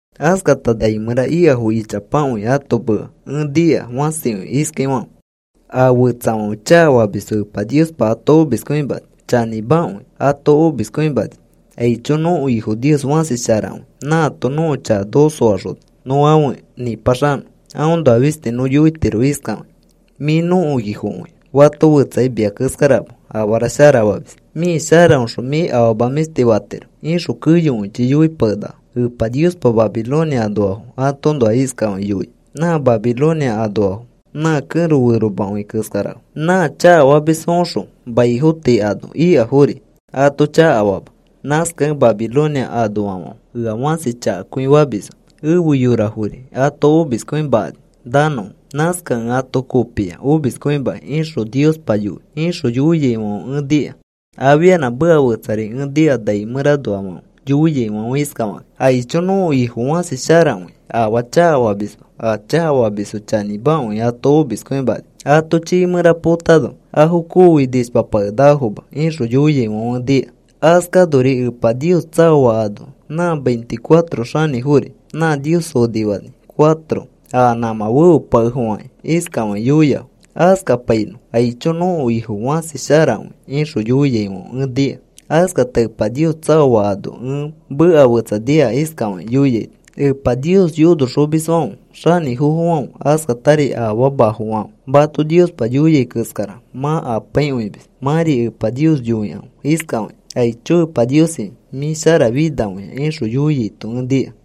Askata nai mẽra ikafo ichapakõi ãto meka ẽ nika, fãsikõi iskaifãfe: A fetsafãfe chakafamisfo Epa Niospa ato omiskõimani. Chanĩmakõi, ato omiskõimani. ¡Aicho! Nõko Ifo Nios fãsi sharakõi. Nãato nõko chaka noko soaxona nõ afe nĩpaxanõ. Aõnoa fisti nõ yoitiro iskafakĩ: “Mĩ nõko Ifokõi. Fato fetsakai mia keskarama afara sharafamis. Mĩ sharaõxõ mĩ afama mĩshti fatiro,” ixõ keyokõichi yoipakenakafo. Epa Niospa Babilonia anoafo atoõnoa iskafakĩ yoia: “Nã Babilonia anoafo nã kẽro feromakõi keskarafo. Nã chakafamisfoõxõ maifo tii ano ikafori ato chakafama. Nãskakẽ Babilonia anoafãfe ea fãsi chakakõi famisfo. Efe yorafori ato omiskõimakani nanõfo. Nãskakẽ ẽ ato kopia omiskõimakĩ,” ixõ Epa Niospa yoi, ixõ yoiaifãfe ẽ nika. Afianã meka fetsari ẽ nika nai mẽranoafãfe yoiaifãfe iskafakakĩ: ¡Aicho! Nõko Ifo fãsi sharakõi. Afaa chakafamisma. A chakafamisfo chanĩmakõi ato omiskõimani. Ato chiifã mẽra potano afo kooi nishpapakenakafoma, ixõ yoiaifãfe ẽ nika. Askanori Epa Nios tsaoa ano nã veinticuatro xanĩfori nã Nios onifani cuatro a nãmã feopakekafakĩ iskafakĩ yoiafo: “Askapainõ. ¡Aicho! ¡Nõko Ifo fãsi sharakõi!” ixõ yoiaifãfe ẽ nika. Askata Epa Nios tsaoa anoa ẽ meka fetsa nika iskafakĩ yoiaito: Epa Nios yonoxomisfãfe xanĩfofofãfe askatari afamafofãfe mato Niospa yoia keskara mã apaikõimis. Mãri Epa Nios yoikãfe iskafakĩ: “¡Aicho! ¡Epa Niosi, mĩ sharafinakõia!” ixõ yoiaito ẽ nika.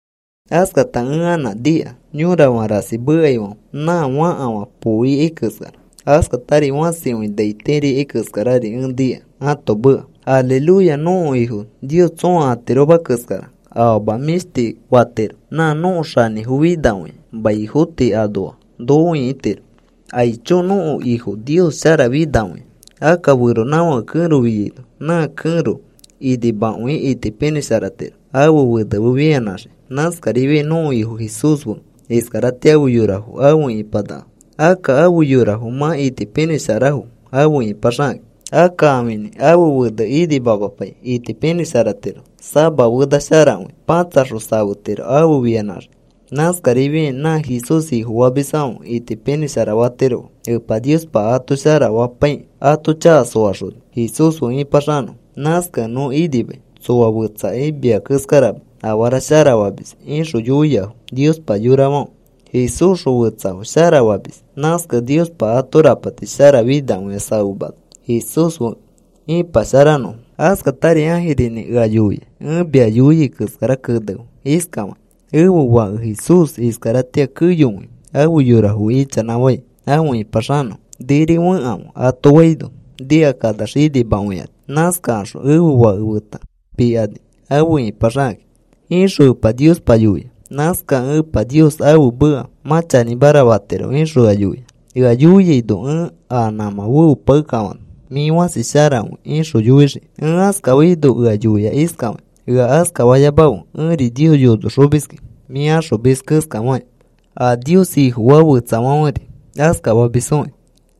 Askatari ẽ anã nika yõrafã rasi mekaifãfe nã fakafã poo ikai keskara, askatari fãsikõi nai tiri ikai keskarari ẽ nika ãto meka: ¡Aleluya! Nõko Ifo Nios tsõa atiroma keskara afama mĩshti fatiro. Nã nõko Xanĩfo finakõia. Maifo tii anoafo noko ĩkitiro. ¡Aicho! ¡Nõko Ifo Nios sharafinakõia! Akka feronãfãke kẽro fiaino nã kẽro inimakõi itipinĩsharatiro ãfe fene fe fianãxiki. Nãskarifiai nõko Ifo Jesús fe iskaratĩa afe yorafo afe ipanakafo. Akka afe yorafo mã itipinĩsharafo afe ipaxakakĩ. Akka ãfinĩ ãfe fene inimamapai itipinĩsharatiro. Sama fena sharakõi patsaxõ safetiro afe fianãxikĩ. Nãskarifiakĩ nã Jesús Ifofamisfãfe itipinĩshara fatirofo. Epa Niospa ato shara fapaikĩ, ato chaka soaxoni Jesús fe ĩpaxanõfo. Nãskakẽ nõ inimai. Tsoa fetsakai mia keskarama afara shara famis, ixõ yoiafo. Niospa yorafãfe Jesúsxõ fetsafo sharafamis. Nãskakẽ Niospa ato rapati sharafinakõi safemana Jesús fe ipasharanõfo. Askatari ãjirinĩ ea yoia: “Ẽ mia yoiai keskara kenefe iskafakĩ: ‘Ẽfe Fake Jesús iskaratĩa keyokõi afe yorafo ichanãfai afe ĩpaxanõfo. “Niri fekãfe,” ato faino, nikakanax inimakõikani. Nãskakaxõ ẽfe Fake feta pikani afe ipaxakakĩ,’ ixõ Epa Niospa yoia. Nãskakẽ Epa Nios ãfe meka mã chanĩmara fatiro,” ixõ ea yoia. Ea yoiaino ẽ a nãmã feopakekafana, “Mĩ fãsi sharakõi,” ixõ yoixiki. Ẽ askafaino ea yoia iskafakĩ: “Ea askafayamafe. Ẽri Nios yonoxomiski mĩ axomis keskafakĩ, a Nios Ifofaa fetsafãferi askafamisfokĩ.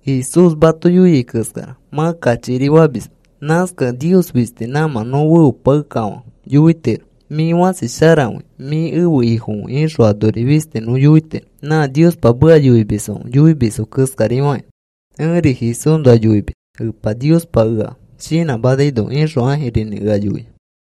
Jesús mato yoiai keskara mã kachikiri famisma. Nãskakẽ Nios fisti nãmã nõ feopakekafã yoitiro: ‘Mĩ fãsi sharakõi. Mĩ ẽfe Ifokõi,’ ixõ anori fisti nõ yoitiro. Nã Niospa meka yoimisfãfe yoimisfo keskarifakĩ ẽri Jesúsnoa yoimis Epa Niospa ea shinãmanaino,” ixõ ãjirinĩ ea yoia.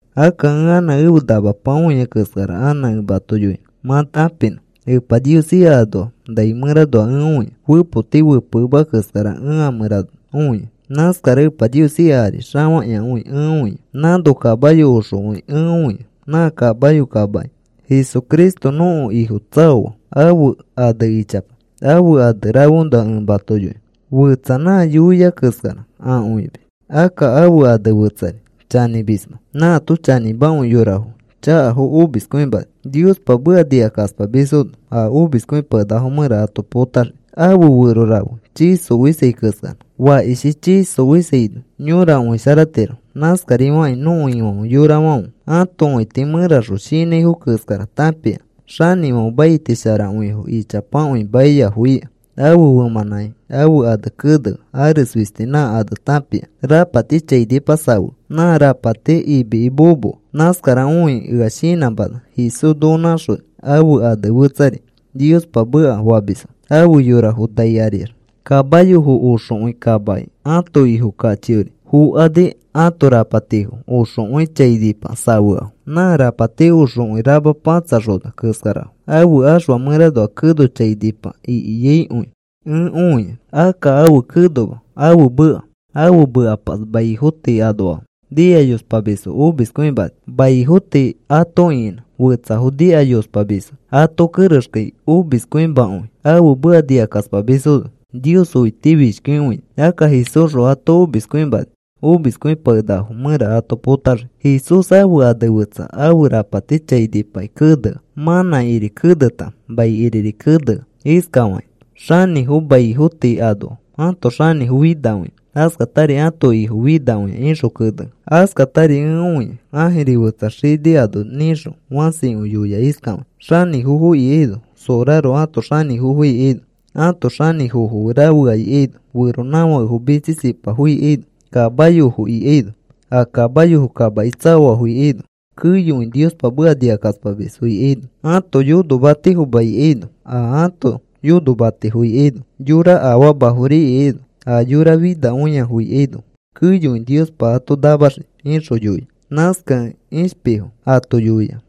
Akka ẽ anã ẽfe namapa õia keskara anã ẽ mato yoinõ mã tãpinõ. Epa Nios ika anoa nai mẽranoa ẽ õia. Fepoti fepekemea keskara ẽ a mẽra õia. Nãskara Epa Nios ika ari xafakĩakõi ẽ õia. Nãno kamayo oxokõi ẽ õia. Nã kamayo kamaki Jesucristo nõko Ifo tsaoa. Ãfe ane ichapa. Ãfe ane rafeõnoa ẽ mato yoinõ. Fẽtsa, “Nã Yoia Keskara Akõimis.” Akka ãfe ane fetsari, “Chanĩmisma.” Nãato chanĩmakõi yora chakafo omiskõimani. Niospa meka nikakaspamisfono a omiskõipakenakafo mẽra ato potaxii. Ãfe fero rafe chii xofisai keskara. Fakishi chii xofisaino yõra õisharatiro. Nãskarifakĩ nõko Ifãfe yorafãfe ãto õiti mẽraxõ shinãifo keskara tãpia. Xanĩfãfe maiti sharakõifo ichapakõi maiafo ika. Ãfe femãnãki ãfe ane kenea. Ares fisti nã ane tãpia. Rapati chainipa safea. Nã rapati imiki momoa. Nãskara õikĩ ea shinãmana Jesús noko nãxoni. Ãfe ane fetsari, “Niospa Meka,” famisfo. Afe yorafo nai ariax kamayofo oxokõi kamaki ãto Ifo kachiori fokani. Ãto rapatifo oxokõi chainipa safeafo. Nã rapati oxokõi rama pãtsaxona keskarafo. Ãfe axfa mẽranoa keno chainipa ikiaikõi ẽ õia. Akka ãfe kenoma, ãfe meka. Ãfe mekapas maifo tii anoafo nikayospamisfo omiskõimani. Maifo tii ato ĩkinã, fetsafo nikayospamisfo ato kerexkai omiskõimakõi. Ãfe meka nikakaspamisfono Nios õitifishkikõini. Akka Jesúsxõ ato omiskõimani, omiskõipakenakafo mẽra ato potaxii. Jesús ãfe ane fetsa ãfe rapati chainipaki kenea mãnãkiri keneta maikiriri kenea iskafakĩ: “Xanĩfo maifo tii anoa ãto Xanĩfo finakõia, askatari ãto Ifo finakõia,” ixõ kenea. Askatari ẽ õia ãjiri fetsa xini ano nĩxõ fãsikõi yoia iskafakĩ: “Xanĩfofo ikaino, sorarofo ãto xanĩfofo ikaino, ãto xanĩfofo fe rafea ikaino, feronãfakefo mitsisipafo ikaino, kamayofo ikaino, a kamayofo kamaki tsaoafo ikaino, keyokõi Niospa meka nikakaspamisfo ikaino, ato yonomatifoma ikaino, a ãto yonomatifo ikaino, yora afamafori ikaino, a yora finakõiafo ikaino, keyokõi Niospa ato namaxii,” ixõ yoia. Nãskakẽ ishpifo ato yoia: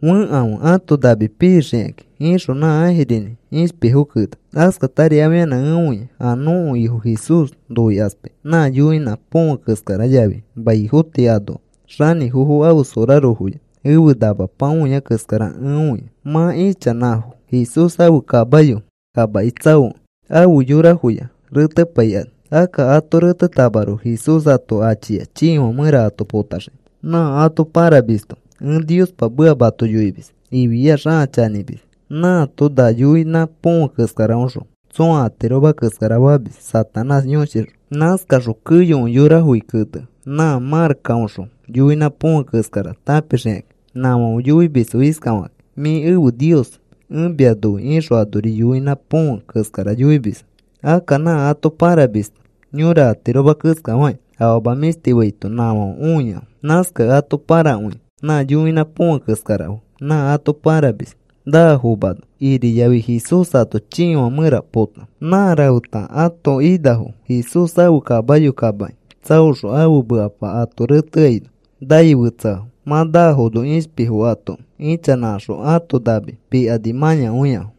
“Fekãfe ãto nami pixikakĩ,” ixõ nã ãjirinĩ ishpifo kena. Askatari afianã ẽ õia a nõko Ifo Jesús noikaspai nã yoinã põfe keskara yafi maifo tii anoa xanĩfofo ãfe sorarofoya ẽfe namapa õia keskara ẽ õia. Mã ichanãfo Jesús ãfe kamayo kamaki tsaokẽ afe yorafoya retepaikani. Akka ato retetamaroko Jesús ato achia chiifã mẽra ato potaxiki. Nã ato pãramisto, “Ẽ Niospa meka mato yoimis,” ifiax ãa chanĩmis. Nãato na yoinã põfe keskaraõxõ tsõa atiroma keskara famis Satanás yõshixõ. Nãskaxõ keyokõi yorafoki kenea nã marakkaõxõ yoinã põfe keskara tãpixikani. Nãfãfe yoimisfo iskafakakĩ: “Mĩ ẽfe nios. Ẽ mia noi,” ixõ anori yoinã põfe keskara yoimisfo. Akka nã ato pãramisto yõra atiroma keskafakĩ afama mĩshti faito nãfãfe õiafo. Nãskakẽ ato pãrakõia. Nã yoinã põfe keskara fe nã ato pãramis naafomano iriyafi Jesús ato chiifã mẽra pota. Nã rafeta ãto inafo Jesús ãfe kamayo kamaki tsaoxõ ãfe mekapa ato reteaino nai fetseafo. Mã naafono ishpifo atoki ichanãkaxõ ãto nami pikani mãyakõiafo.